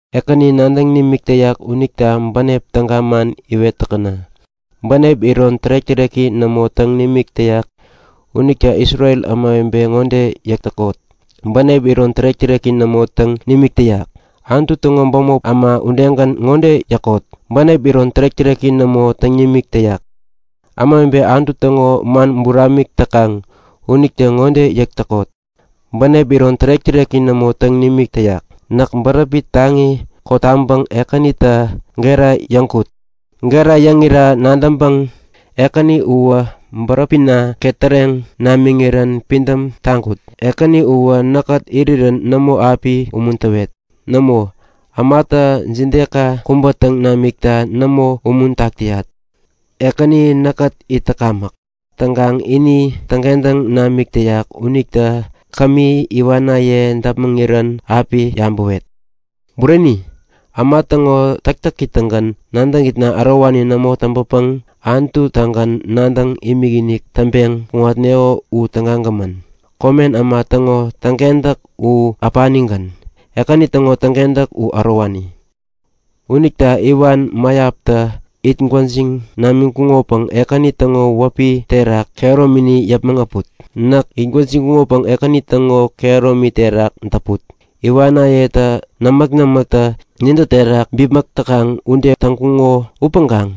Ekäni nadäŋ nimik täyak unita bänep täga man iwet täkäna. Bänep iron tärek-täreki nämo täŋ nimik täyak. Unita Isrel ämawebe ŋode yäkot; Bänep iron tärek-täreki nämo täŋ nimik täyak! Anutu täŋo bämop äma udegän ŋode yäkot; Bänep iron tärek-täreki nämo täŋ nimik täyak! Ämawebe Anutu täŋo man buramik täk täkaŋ unitä ŋode yäk täkot; Bänep iron tärek-täreki nämo täŋ nimik täyak! Näkä bäräpi taŋi kotaŋpäŋ Ekänita gera yäŋkut. Gera yäŋira nadäŋpäŋ Ekäni uwä bäräpina ketäreŋ namiŋirän pidäm taŋkut. Ekäni uwä näkkät irirän nämo api umuntäwet. Nämo, ämatä imaka kubä täŋ namikta nämo umuntak täyat. Ekäni näkkät it täkamäk. Täŋkaŋ ini täŋkentäŋ namik täyak unita kämi iwanaye däpmäŋirän api yabäwet. Bureni! Äma täŋo täktäki-tagän nadäŋitna ärowani nämo täŋpäpäŋ Anututagän nadäŋ imikinik täŋpeŋ kuŋatneŋo u tägagämän. Komen äma täŋo täŋkentäk u äpanigän. Ekäni täŋo täŋkentäk u ärowani. Unita iwan mäyaptä it gwäjiŋ namiŋkuŋopäŋ Ekäni täŋo wäpi terak kehäromini yäpmäŋ äput. Näk it gwäjiŋkuŋopäŋ Ekäni täŋo kehäromi terak däput. Iwanayetä nämäk-nämäktä nintä terak bipmäk täkaŋ ude täŋkuŋo upäŋkaŋ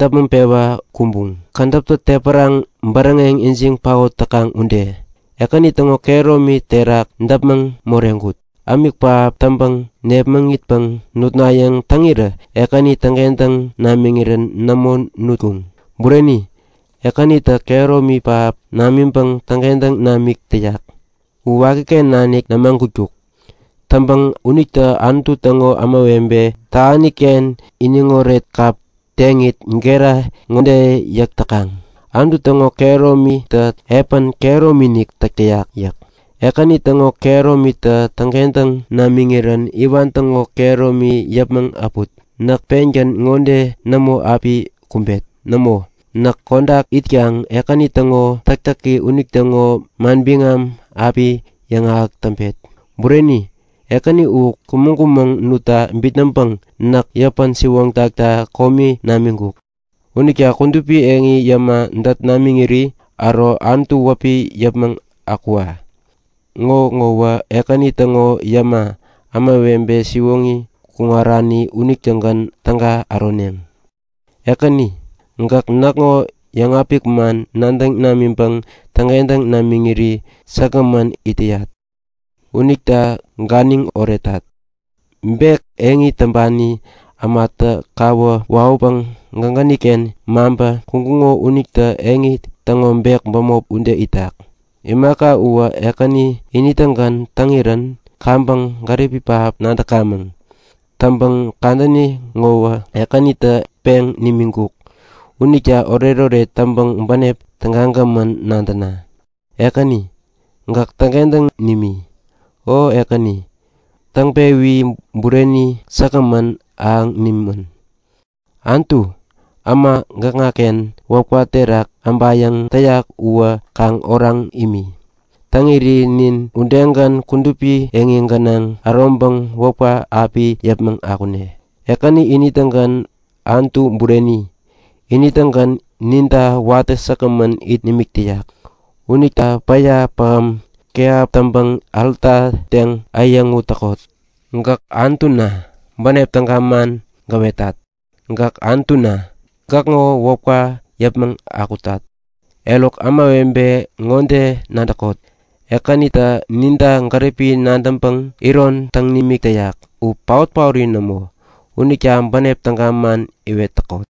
däpmäŋ-pewa kumbuŋ, kädäptä tepäraŋ bäräŋeŋ ijiŋ paot täkaŋ ude. Ekäni täŋo kehäromi terak däpmäŋ moreŋkut. Ämik pähap täŋpäŋ nepmäŋitpäŋ nutnayäŋ täŋirä Ekänitä täŋkentäŋ namiŋirän nämo nutkuŋ. Bureni, Ekänitä kehäromi pähap namiŋpäŋ täŋkentäŋ namik täyak. U wakiken nanik nämagutkuk. Täŋpäŋ unita Anutu täŋo ämawebe tähaniken iniŋoret kap teŋit gera ŋode yäk täkaŋ; Anutu täŋo kehäromitä epän kehäromi-inik täk täyak! yäk. Ekäni täŋo kehäromitä täŋkentäŋ nimiŋirän iwan täŋo kehäromi yäpmäŋ äpumäŋ. Näk pengän ŋode nämo api kumbet. Nämo! Näk kodak itkaŋ Ekäni täŋo täktäki unitäŋo manbiŋam api yäŋahäk täŋpet. Bureni, Ekäni uwä kumäŋ-kumäŋ nutta bitnäŋpäŋ näk yäpä-siwoŋtakta komigän namiŋkuk. Unita kudupi yot yäma dät namiŋirä äro Anutu wäpi yäpmäŋ akwa! Ŋo ŋowä Ekäni täŋo yäma, ämawebe siwoŋi kuŋarani unitägän täga äroneŋ. Ekäni, gäk näkŋo yäŋapik man nadäŋ namiŋpäŋ täŋkentäŋ namiŋiri säkgämän it täyat. Unita ganiŋ oretat! Bek eŋi täŋpani ämatä kawä wawäpäŋ gägäniken maŋpä kuŋkuŋo unitä eŋi täŋo bek bämopi ude itak. Imaka uwä Ekäni ini-tägän täŋirän kaŋpäŋ gäripi pähap nadäkamäŋ. Täŋpäŋ kadäni ŋowä Ekänitä peŋ nimiŋkuk. Unita oretoret täŋpäŋ bänep tägagämän nadäna! Ekäni, gäk täŋkentäŋ nimi. O Ekäni, täŋpewi bureni säkgämän ahäŋ nimän! Anutu, äma gäkŋaken wäpka terak äbayäŋ täyak uwä kaŋ oraŋ imi. Täŋiri nin udegän kudupi yot gänaŋ äroŋpäŋ wäpka api yäpmäŋ akune. Ekäni ini-tägän Anutu bureni! Ini-tägän ninta watä säkgämän it nimik täyak. Unita päya pähäm kehap täŋpäŋ alta teŋ äyäŋut täkot. Gäk Anutuna! Bänep täga man gäwetat. Gäk Anutuna! Gäkŋo wäpka yäpmäŋ akutat. Eruk ämawebe ŋode nadäkot; Ekänitä ninta gäripi nadäŋpäŋ iron täŋ nimik täyak u paot-paori nämo unita bänep täga man iwet täkot.